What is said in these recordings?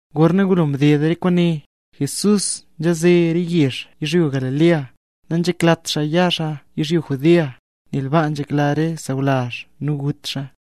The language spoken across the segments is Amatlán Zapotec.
Gorna ngulo mded re kwaane, Jesús nzhaze re yezh yizhyo Galilea, nanzheklat xaa ya xaa yizhyo Judea, nel baa nzhekla re sawlazh nu gut xaa.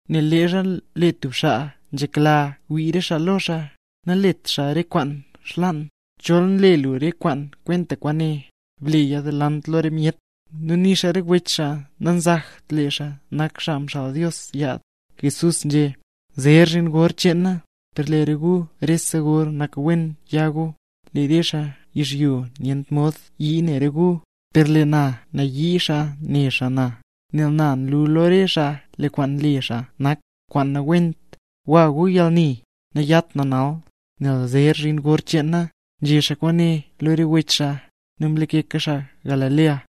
Nel leezha lee tub xaa nzhekla xaa wii re xaa lo xaa, nanlet xaa re kwaan xlaan. Chol nle lu re kwaan kwenta kwaane, bleya delant lo re myet. Nu nixa re wech xaa nanzakt lee xaa nak xaa mxaal Dios yaad. Jesús nzhé: —Zer zhin gor cheen na, per lee re gu rese gor nak wen ya gu. Lee re xaa yizhyo nyent mod yii ne re gu; per lee na nayii xaa ne xaa na, nel na nlu lo re xaa lee kwaan nle xaa nak kwaan nawent. Gwa gu yalni, nayat na nal, nel zer zhin gor cheen na. Nzhé xaa kwaane lo re wech xaa, nu mlakeka xaa Galilea.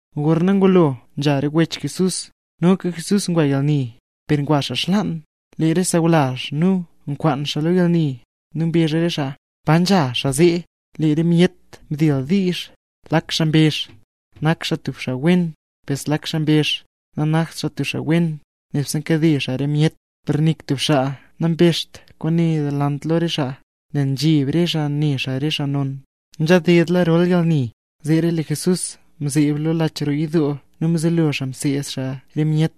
Gorna ngulo nzha re wech Jesús, noka Jesús ngwa yalni, per ngwa xaa xlaan. Lee re xaa sawlazh nu nkwaan xaa lo yalni, nu mbezh re xaa: —¿Pa nzha xaa zee? Lee re myet mdildiizh. Lak xaa mbezh: “Nak xaa tub xaa wen”; per zlak xaa mbezh: “Nanakt xaa tub xaa wen; nebse nkade xaa re myet”. Per nik tub xaa nabezht kwaane delant lo re xaa, nel nzheb re xaa ne xaa re xaa non. Nzhadedla rol yalni, zeera lee Jesús mzeeb lo lach roo yidoo nu mzelo xaa mseed xaa re myet.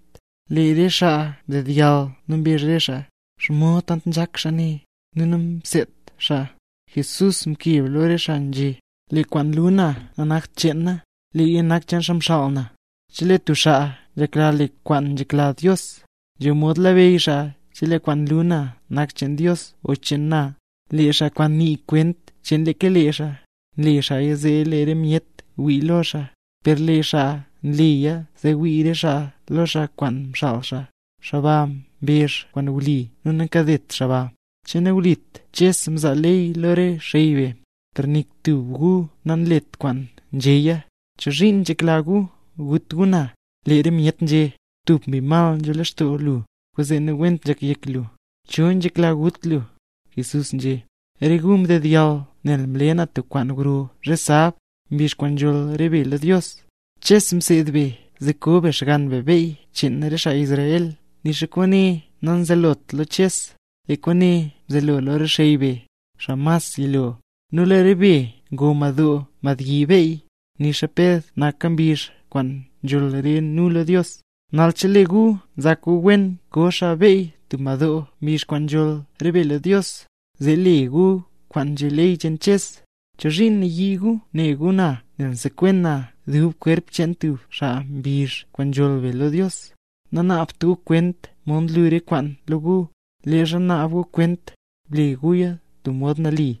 Lee re xaa ndedyall nu mbezh re xaa: —¿Xomod tant nzhak xaa ne, nu namseedt xaa? Jesús mkeb lo re xaa nzhé: —Lee kwaan nlu na nanakta cheen na, leeya nak cheen xaa mxaal na. Chelee tub xaa nzhekla le kwaan nzhekla Dios, nzho mod labeyy xaa chelee kwaan nlu na nak cheen Dios o cheen na. Lee xaa kwaan nii kwent cheen leeka lee xaa, nle xaaya zee lee re myet wii lo xaa; per lee xaa nleya zee wii re xaa lo xaa kwaan mxaal xaa, xaa ba mbezh kwaan wli nu nankadet xaa ba. ’¿Che nawlit Ches mzaa ley lo re xey be? Per nik tub gu nanlet kwaan nzhéya. ¿Chozhiin nzhekla gu gut gu na? Lee re myet nzhé: —¡Tub mbi mal nzho lextoo lu, kwaanzee nawent nzhak yek lu! ¿Cho nzhekla gut lu? Jesús nzhé: —Re gu mdedyall nel mle na tub kwaan gro zhe sab, mbizh kwaan nzholl re be lo Dios. Ches mseed be zee koo be xgann be beyy cheen re xaa sawlazh be (nixa kwaane namzelot lo Ches, lee kwaane mzelo lo re xey be, xaa mas yilo). Nu lee re be ngoo madoo madbyi beyy, nixa ped naka mbizh kwaan nzholl re be lo Dios. Nal chelee gu nzak gu wen koo be beyy tub madoo mbizh kwaan nzholl re be lo Dios, zee le be kwaan nzhé ley cheen Ches, ¿chozhiin nayii gu ne gu na nel msekwen na dub kwerp cheen tub xaa mbizh kwaan nzholl re be lo Dios? Nanaabt gu kwent mod nlu re kwaan lo gu. Leezha naab gu kwent, ble guya tub mod nali.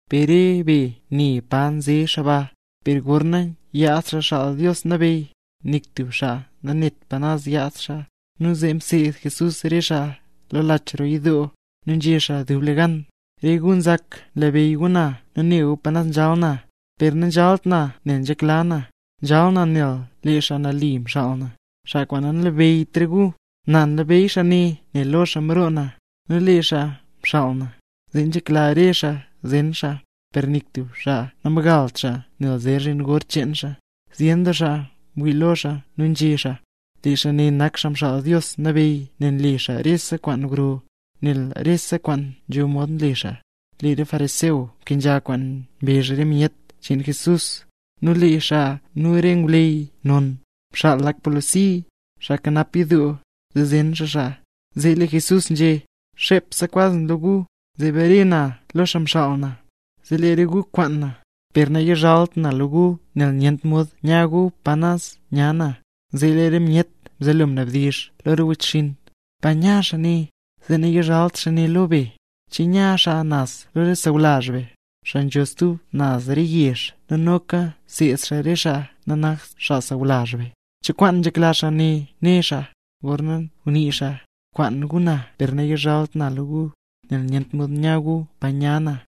Per re be ne pa nze xaa ba, per gorna yaad Xaa Xaal Dios Nabeyy, nik tub xaa nanet pa naz yaad xaa. Nu zee mseed Jesús re xaa lo lach roo yidoo, nu nzhé xaa dublegan: —¡Re gu nzak nlabeyy gu na nu ne gu pa naz nzhal na! Per nanzhalt na nel nzhekla na, nzhal na nel lee xaa nali mxaal na, xaa kwaan nanlabeyyt re gu. Na nlabeyy xaa ne nel lo xaa mroo na, nu lee xaa mxaal na. Zee nzhekla re xaa zen xaa, per nik tub xaa namgalt xaa nel zer zhin gor cheen xaa. Zyen doo xaa mwii lo xaa nu nzhé xaa: —Lee xaa ne nak Xaa Mxaal Dios Nabeyy nel nle xaa rese kwaan gro, nel rese kwaan nzho mod le xaa. Lee re xaa fariseo mkenzha kwaan mbezh re myet cheen Jesús; nu lee xaa nu re ngwleyy non, mxaal lak polisi, xaa nkanap yidoo, zee zen xaa xaa. Zee lee Jesús nzhé: —Xepse kwaz na lo gu, zee bare na lo xaa mxaal na. Zee re gu kwaan na, per nayizhalt na lo gu nel nyent mod ya gu pa nya na. Zee lee re myet mzelo mnabdizh lo re wechxinn: —¿Pa nya xaa ne, zee nayizhalt xaa ne lo be? ¿Che nya xaa naz lo re sawlazh be, xaa nzho stub naz re yezh nu noka seed xaa re xaa nanakt xaa sawlazh be? ¿Cho kwaan nzhekla xaa ne né xaa, gorna ngunii xaa: “Kwaan gu na per nayizhalt na lo gu, nel nyent mod ya gu pa nya na”?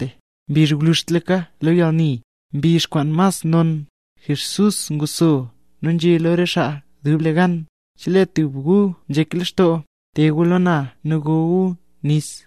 Mbizh gwluzhtlaka lo yalni, mbizh kwaan mas non, Jesús nguxso nu nzhé lo re xaa dublegan: —Chelee tub gu nzhek lextoo, te gu lo na nu go gu nis.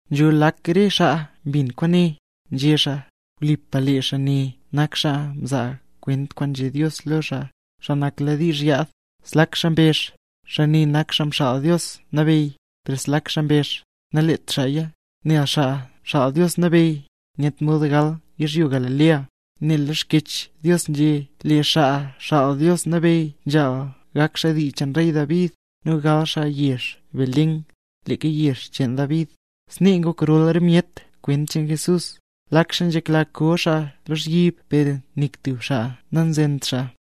Nzho lak re xaa mbin kwaane, nzhé xaa: —Wlipa lee xaa ne nak xaa nzaa kwent kwaan nzhé Dios lo lee xaa, xaa nakladiizh yaad. Zlak xaa mbezh: —Xaa ne nak Xaa Mxaal Dios Nabeyy. Per zlak xaa mbezh: —Naleet xaaya, nel Xaa Xaal Dios Nabeyy nyent mod ngal yizhyo Galilea, nel lee Xkyech Dios nzhé, lee Xaa Xaal Dios Nabeyy nzhaal gak xaa dii cheen rey David, nu gal xaa naz yezh Belén, leeka yezh pa ngol David. Snee ngok rol myet kwent cheen Jesús. Lak xaa nzhekla ko xaa lozhyib per nik tub xaa namzent xaa.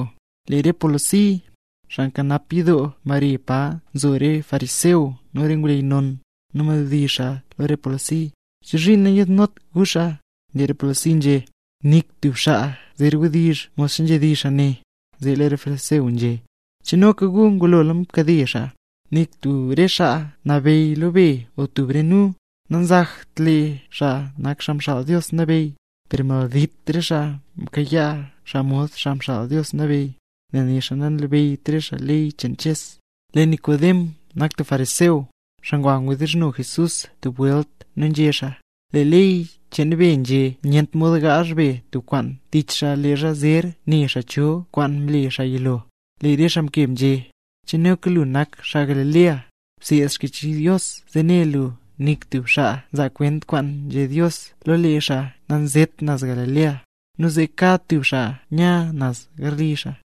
Lee re polisi, xaa nkanap yidoo, mbare pa nzo re fariseo nu re ngwleyy non, nu mnabdizh xaa ne lo re polisi: —¿Chozhiin nayiidnot gu xaa? Lee re polisi nzhé: —¡Nik tub xaa zer wdizh modxa nzhedizh xaa ne! Zee lee re fariseo nzhé: —¿Che noka re gu ngulo mkade xaa? Nik tub re xaa nabeyy lo be o tub re nu, nanzakt lee xaa nak Xaa Xaal Dios Nabeyy. ¡Per maldit re xaa mkayaa xaa mod Xaa Mxaal Dios Nabeyy, nel nixa nanlabeyyt re xaa ley cheen Ches! Lee Nikodem nak tub fariseo, xaa ngwa mdizhno Jesús tub welt nu nzhé xaa: —Lee ley cheen be nzhé nyent mod gaazh be tub kwaan tich xaa leezha zer né xaa cho kwaan mle xaa yilo. Lee re xaa mkeb nzhé: —¿Che noka lu nak xaa Galilea? Bseed Xkyech Dios, zee ne lu nik tub xaa nzaa kwent kwaan nzhé Dios lo lee xaa nanzet naz Galilea. Nu zee kad tub xaa nya naz garli xaa.